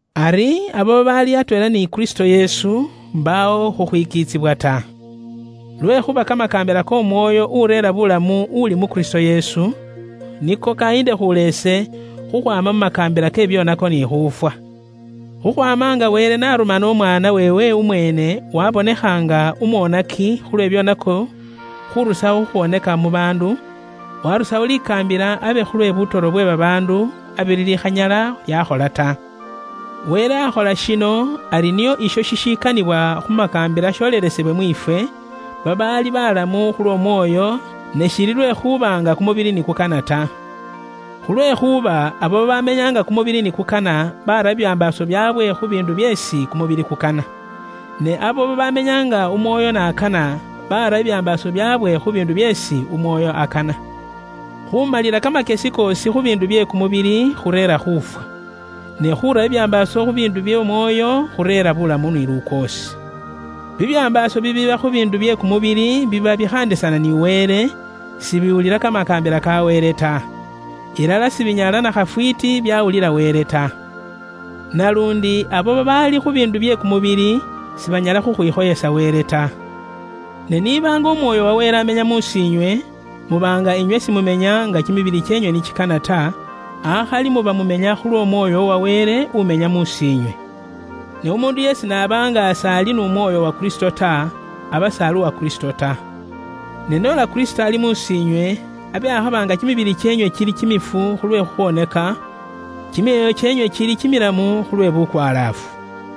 Ari abo babaali atweela ni Kristo Yesu, mbaawo khukhwikiitsibwa ta. Lwekhuuba kamakaambila k'Omwoyo ureera buulamu uuli mu Kristo Yesu, niko kayiindekhuula ise khukhwaama mu makaambila ke bibyoonako ni khuufwa. Khukhwaama nga Wele n'arumana umwaana weewe umweene wabonekha nga umwonaki khulwe bibyoonako khurusawo khukhwoneka mu baandu, warusawo likaambila abe khulwe butoro bwe babaandu abe lilikhanyala lyakhola ta. Wele akhola shino ari nio isho shishikanibwa khu makaambila sholelesebwe mwiifwe, babaali balamu khulw'Omwoyo ne shiili lwekhuuba nga kumubili ni kukana ta. Khulwekhuuba abo babamenya nga kumubili ni kukana bara bibyambaaso byaabwe khu biindu byeesi kumubili kukana. Ne abo babaamenya nga Umwoyo n'akana, bara bibyambaaso byaabwe khu biindu byeesi Umwoyo akana. Khuumalila kamakyesi koosi khu biindu bye kumubili khureera khuufwa. Ne khuura bibyambaaso khu biindu by'Omwoyo, khureera buulamu ni lukoosi. Bibyambaaso bibiiba khu biindu bye kumubili biba bikhaandisana ni Wele; sibiwulila kamakaambila ka Wele ta. Ilala sibinyala na khafwiiti byawulila Wele ta. Naluundi abo babaali khu biindu bye kumubili sibanyala khukhwikhoyesa Wele ta. Ne niiba nga Umwoyo wa Wele amenya mus'iinywe, muba nga inywe simumenya nga kimibili kyeenywe ni kikana ta, akhali muba mumenya khulw'Omwoyo uwa Wele umenya mus'iinywe. Ne umuundu yeesi n'aba nga s'ali n'Umwoyo uwa Kristo ta, aba s'ali uwa Kristo ta. Ne noola Kristo ali mus'iinywe, abe akhaba nga kimibili kyeenywe kili kimifu khulwe bubwoonaki, kimyoyo kyeenywe kili kimilamu khulwe bukwalaafu.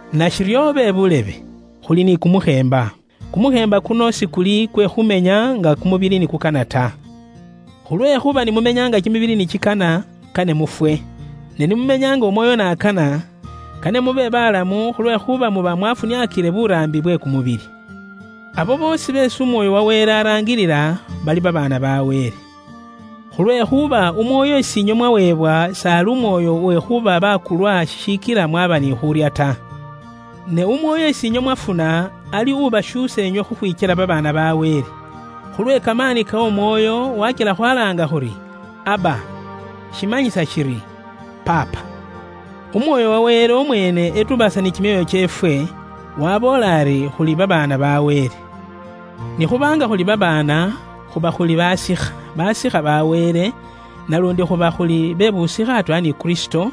Nashiryo be buulebe, khuli ni kumukheemba. Kumukheemba kuno sikuli kwe khumenya nga kumubili ni kukana ta. Khulwekhuuba ni mumenya nga kimibili ni kikana, kane mufwe. Ne ni mumenya nga Umwoyo n'akana, kane mube balamu khulwekhuuba muba mwafuniakile buraambi bwe kumubili. Abo boosi beesi Umwoyo wa Wele araangilila bali babaana ba Wele. Khulwekhuuba Umwoyo is'inywe mwaweebwa s'ali Umwoyo uwe khuuba bakulwa shishikila mwaaba ni khuurya ta. Ne Umwoyo is'inywe mwafuna ali ubashuusa inywe khukhwikyela babaana ba Wele. Khulwe kamaani k'Omwoyo wakila khwalaanga khuri, “Abba,” shimanyisa shiri “Paapa.” Umwoyo uwa Wele umweene etubaasa ni kimyoyo kyeefwe, waboola ari khuli babaana ba Wele. Ni khuba nga khuli babaana, khuba khuli basikha; basikha ba Wele, naluundi khuba khuli be busikha atweela ni Kristo,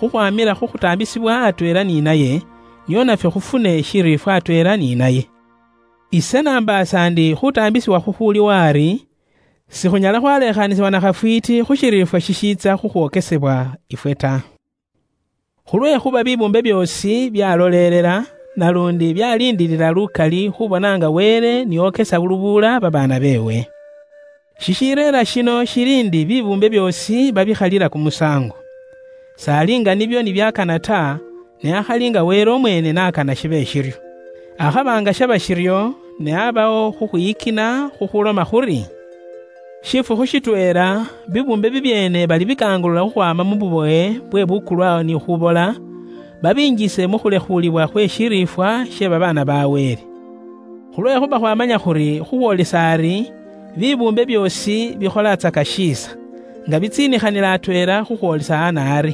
khukhwamila khu khutaambisibwa atweela ni naye, nio nafwe khufune shiriifwa atweela ni naye. Ise nambaasa ndi khuutaambisibwa khukhuuliwo ari, sikhunyala khwalekhaanisibwa na khafwiiti khu shiriifwa shishiitsa khukhwokesebwa ifwe ta. Khulwekhuuba bibuumbe byoosi byaloleelela, naluundi byaliindiilila lukali khubona nga Wele ni okesa lubuula babaana beewe. Shishireera shino shili ndi bibuumbe byoosi babikhalila kumusaango. S'ali nga nibyo ni byakana ta, ne akhali nga Wele umweene n'akana shibe shiryo. Akhaba nga shaba shiryo, ne aabawo khukhwiyikina khukhuuloma khuri; shifukhu shitweela bibuumbe bibyeene balibikangulula khukhwaama mu bubowe bwe bukulwa ni khubola, babingise mu khulekhuulibwa khwe shiriifwa she babaana ba Wele. Khulwekhuuba khwaamanya khuri khukhwoolisa ari, bibuumbe byoosi bikholatsaka shiisa, nga bitsiinikhanila atweela khukhwoolisa ana ari.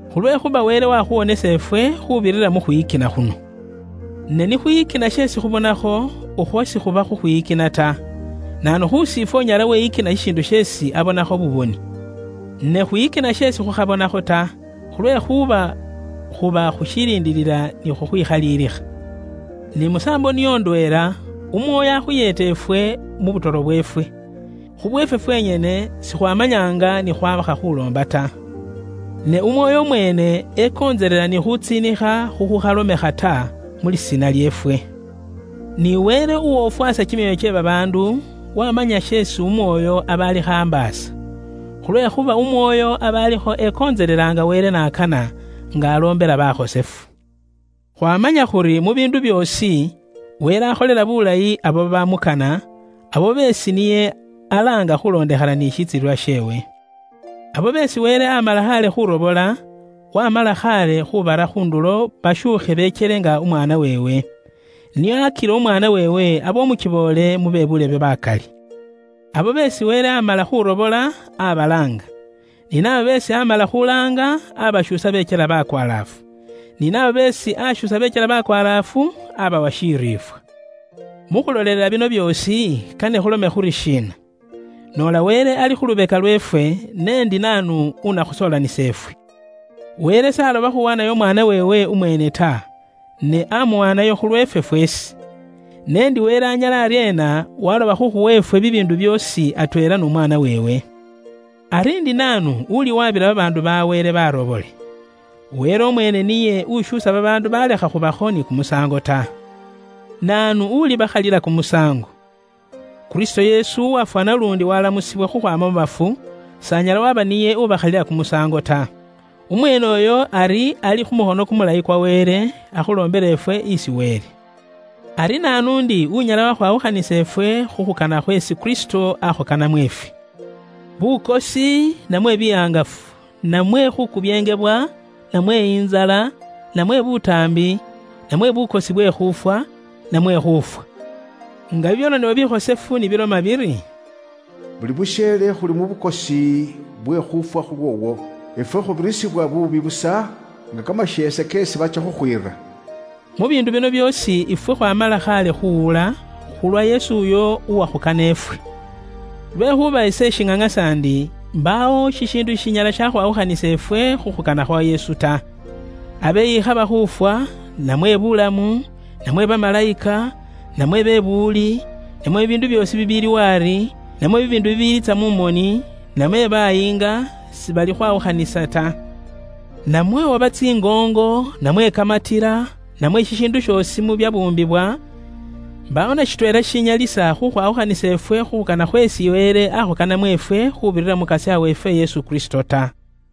Khulwekhuuba Wele wakhuwonesa ifwe khuubirira mu khwiyikina khuno. Ne nikhwiyikina sheesi khubonakho, ukhwo sikhuba khukhwiyikina ta. Naanu khusifwe unyala weyikina shishiindu sheesi abonakho buboni? Ne khwiyikina sheesi khukhabonakho ta, khulwekhuuba khuba khushiliindiilila ni khukhwikhaliilikha. Ni musaambo niyo indweela, Umwoyo akhuyeeta ifwe mu butoro bweefwe. Khubweefwe fwenyene, sikhwaamanya nga ni khwaakha khwaaloomba ta. Ne Umwoyo umweene ekontselela ni khuutsiinikha khukhukhalomekha ta, mu lisiina lyeefwe. Ni Wele, uwofwasa kimyoyo kye babaandu, wamanya sheesi Umwoyo aba alikho ambaasa. Khulwekhuuba Umwoyo aba alikho ekontselela nga Wele n'akana, nga aloombela bakhosefu. Khwaamanya khuri mu biindu byoosi, Wele akholela buulayi abo babamukana; abo beesi niye alaanga khuulondekhana ni shitsilililwa sheewe. Abo beesi Wele aamala khaale khuurobola, waamala khaale khuubara khu ndulo bashuukhe bekyele nga Umwaana weewe, nio akile Umwaana weewe abe umukiboole mu be buulebe bakali. Abo beesi Wele aamala khuurobola, abalaanga; ni naabo beesi aamala khuulaanga, aabashuusa bekyela bakwalaafu; ni nabo beesi aashuusa bekyela bakwalaafu, aabawa shiriifwa. Mu khulolelela bino byoosi, kane khulome khuri shiina? Noola Wele ali khu lubeka lweefwe, ne ndi naanu unakhusoolanisa ifwe? Wele s'aloba khuuwaanayo Umwaana weewe umweene ta, ne aamuwaanayo khulweefwe fweesi. N'endi Wele anyala aryeena waloba khukhuwa ifwe bibiindu byoosi atweela n'Umwaana weewe? Ari ndi naanu uliwabila babaandu ba Wele barobole? Wele umweene niye ushuusa babaandu balekha khuubakho ni kumusaango ta. Naanu ulibakhalila kumusaango? Kristo Yesu uwafwa naluundi waalamusibwa khukhwaama mu bafu, s'anyala waaba niye ubakhalila kumusaango ta. Umweene uyo ari ali khu mukhono kumulayi kwa Wele, akhuloombela ifwe isi Wele. Ari naanu ndi unyala wakhwawukhanisa ifwe khu khukana khweesi Kristo aakhukanamo ifwe? Bukosi, namwe bihangafu, namwe khuukubyeengebwa, namwe intsala, namwe butaambi, namwe bukosi bwe khuufwa, namwe khuufwa? Nga bibyaronebwa bikhosefu ni biloma biri, “Buli busheele khuli mu bukosi bwe khuufwa khulwoowo. Ifwe khubirisibwa buubi busa nga kamasheese keesi batsya khukhwiira.” Mu biindu bino byoosi ifwe khwaamala khaale khuuwula, khulwa Yesu uyo uwakhukana ifwe! Lwekhuuba ise ishiŋaŋasa ndi mbaawo shishiindu shishinyala shakhwawukhanisa ifwe khu khukana khwa Yesu ta. Abe ikhaba khuufwa, namwe buulamu, namwe bamalayika, namwe be buwuli, namwe bibiindu byoosi bibiiliwo ari, namwe bibiindu bibiliitsa mu moni, namwe bayiinga, sibilikhwawukhanisa ta. Namwe oba tsingoongo, namwe kamatila, namwe shishiindu shoosi mu byabuumbibwa, mbaawo na shitweela shishinyalisa khukhwawukhanisa ifwe khu khukana khweesi Wele aakhukanamo ifwe khuubirira mu Mukasya weefwe Kristo Yesu ta.